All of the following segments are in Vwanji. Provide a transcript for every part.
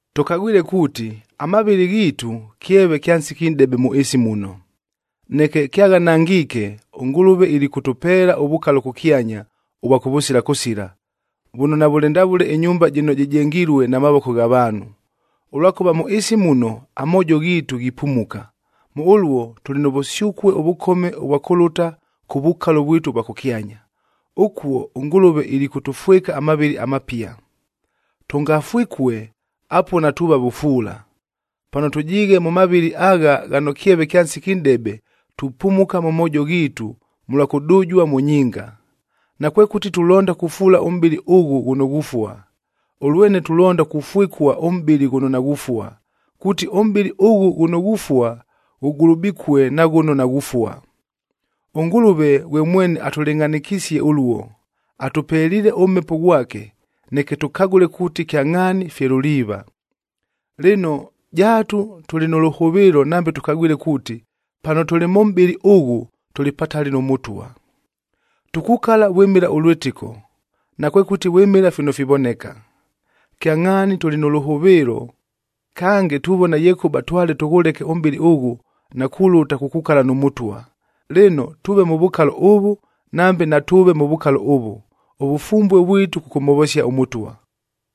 Tʉkagwile kuuti, amavɨlɨ ghiitu kyeve kya nsiki nʼdebe mʉ ɨɨsi muno. Neke kyaghanangiike, ʉNgʉlʉve ilikʉtʉpeela ʉvukalo kʉkyanya, ʉvwa kʉvʉsila kʉsila, vʉno navʉlɨ ndavʉle ɨnyumba jɨno jɨjengilue na mavoko gha vaanhu. Ʉlwakʉva mʉ ɨɨsi muno amoojo ghiitu ghipumuka, mʉ ʉluo tʉlɨ nʉ vʉsyʉkue ʉvʉkome ʉvwa kʉlʉta kʉ vukalo vwitu ʉvwa kʉkyanya, ʉkuo ʉNgʉlʉve ilikʉtʉfwɨka amavɨlɨ amapia. Tʉngafwɨkue, apuo natuuva vʉfuula. Pano tʉjiighe mʉ mavɨlɨ agha ghano kyeve kya nsiki nʼdebe, tupumuka mʉ moojo ghiitu mʉlwa kʉdʉjua mʉ nyinga. Nakwekʉti tulonda kufuula ʉmʼbɨlɨ ʉghʉ ghʉno ghufua, ʉlwene tulonda kʉfwɨkua ʉmʼbɨlɨ ghʉno naghufua, kuuti ʉmʼbɨlɨ ʉghʉ ghʉno ghufua ghʉgulubikue na ghʉno naghufua. ɄNgʉlʉve ghwe mwene atʉlɨngʼhanɨkisie ʉluo, atʉpeliile ʉMhepo ghwake, neke tʉkagʉle kuuti kyangʼhaani fye luliiva. Lɨno, jaatu tʉlɨ nʉ lʉhʉvɨɨlo nambe tʉkagwile kuuti, pano tʉlɨ mʉ mʼbɨlɨ ʉghʉ, tʉlɨ patali nʉ Mʉtwa. Tukukala vwɨmɨla ʉlwɨtɨko, nakwekʉti vwɨmɨla fino fivoneka. Kyangʼhaani tʉlɨ nʉ lʉhʉvɨɨlo, kange tuvona yekʉba twale tʉghʉleke ʉmʼbɨlɨ ʉghʉ, na kulʉta kukukala nʉ Mʉtwa. Lɨno, tʉʉve mʉ vukalo ʉvʉ, nambe natʉʉve mʉ vukalo ʉvʉ, ʉvʉfumbue vwitu kʉkʉmhovosia ʉMʉtwa.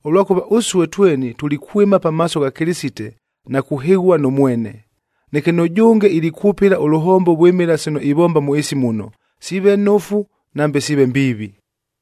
Ʉlwakʉva ʉsue tweni tulikwɨma pamaaso gha Kɨlɨsite na kuhɨghua nʉ mwene. Neke nʉjʉnge ilikwʉpɨla ʉlʉhombo vwɨmɨla sino ivomba mʉ ɨɨsi muno, siive nofu nambe siive mbiivi.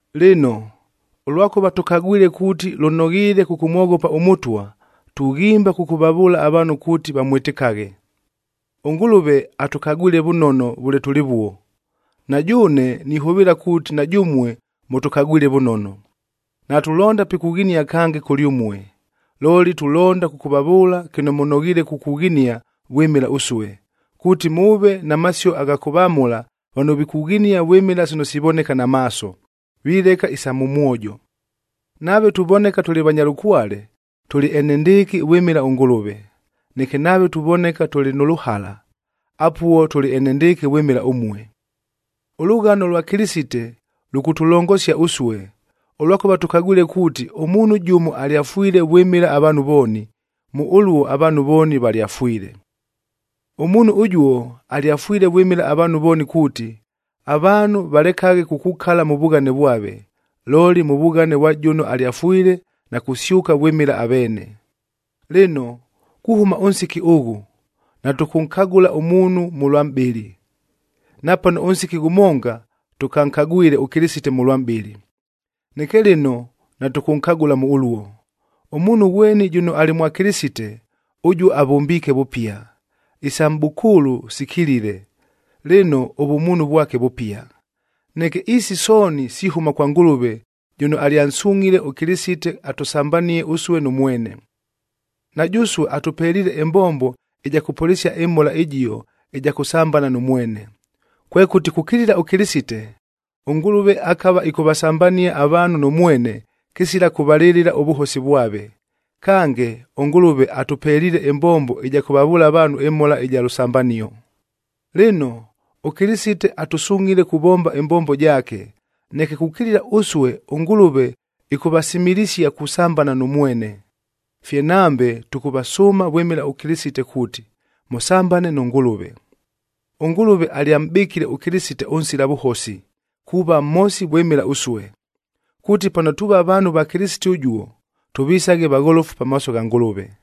Lɨno, ʉlwakʉva tʉkagwile kuuti lʉnoghiile kʉkʉmwoghopa ʉMʉtwa, tughimba kʉkʉvavʉʉla avaanhu kuuti vamwɨtɨkaghe. ɄNgʉlʉve atʉkagwile vʉnono vʉle tʉlɨvuo, na jʉʉne nihʉvɨɨla kuuti na jʉmue mʉtʉkagwile vʉnono. Natulonda pikughinia kange kʉlyʉmue, looli tulonda kʉkʉvavʉʉla kɨno mʉnoghiile kukughinia vwɨmɨla ʉsue, kuuti mʉʉve na masio agha kʉvamʉla vano vikughinia vwɨmɨla sino sivoneka na maaso, vileka isa mʉ mwojo. Nave tuvoneka tʉlɨ vanya lʉkwale, tʉlɨ enendɨɨkɨ vwɨmɨla ʉNgʉlʉve, neke nave tuvoneka tʉlɨ nʉ lʉhala, apuo tʉlɨ enendɨɨkɨ vwɨmɨla ʉmue. Ʉlʉghano lwa Kɨlɨsite lʉkʉtʉlongosia ʉsue, ʉlwakʉva tʉkagwile kuuti ʉmuunhu jʉmo alyafwile vwɨmɨla avaanhu vooni, mʉ ʉluo avaanhu vooni valyafwile. Ʉmuunhu ʉjuo, alyafwile vwɨmɨla avaanhu vooni kuuti, avaanhu valekaghe kukukala mʉ vughane vwave, looli mʉ vughane vwa jʉno alyafwile na kusyʉka vwɨmɨla aveene. Lɨno, kuhʉma ʉnsiki ʉghʉ, natʉkʉnkagʉla ʉmuunhu mʉlwa mʼbɨlɨ. Napano ʉnsiki ghʉmonga tʉkankagwile ʉKɨlɨsite mʉlwa mʼbɨlɨ, neke lɨno natʉkʉnkagʉla mʉ ʉluo. Ʉmuunhu ghweni jʉno alɨ mwa Kɨlɨsite, ʉjuo avʉmbiike vʉpia, isa mʼbʉkʉʉlʉ sikilile, lɨno ʉvʉmuunhu vwake vʉpia! Neke isi sooni sihʉma kwa Ngʉlʉve jʉno alyansungʼhile ʉKɨlɨsite atʉsambanie ʉsue nʉ mwene. Na jʉsue atʉpeliile ɨmbombo ɨja kʉpʉlɨsia ɨmhola ɨjio ɨja kʉsambana nʉ mwene. Kwekʉti kukilila ʉKɨlɨsite, ʉNgʉlʉve akava ɨkʉvasambania avaanhu nʉ mwene, kɨsila kʉvalɨlɨla ʉvʉhosi vwave. Kange, ʉNgʉlʉve atʉpeliile ɨmbombo ɨja kʉvavʉʉla avaanhu ɨmhola ɨja lʉsambanio. Lɨno, ʉKɨlɨsite atʉsungʼhile kuvomba ɨmbombo jaake, neke kukilila ʉsue ʉNgʉlʉve ɨkʉvasimilisia kusambana nʉ mwene. Fye nambe tʉkʉvasʉʉma vwɨmɨla ʉKɨlɨsite kuuti, mʉsambane nʉ Ngʉlʉve. ɄNgʉlʉve alyamʼbɨkile ʉKɨlɨsite ʉnsila vʉhosi, kuuva mhosi vwɨmɨla ʉsue, kuuti pano tuuva vaanhu va Kɨlɨsite ʉjuo, tʉvisaghe vagholofu pamaaso gha Ngʉlʉve.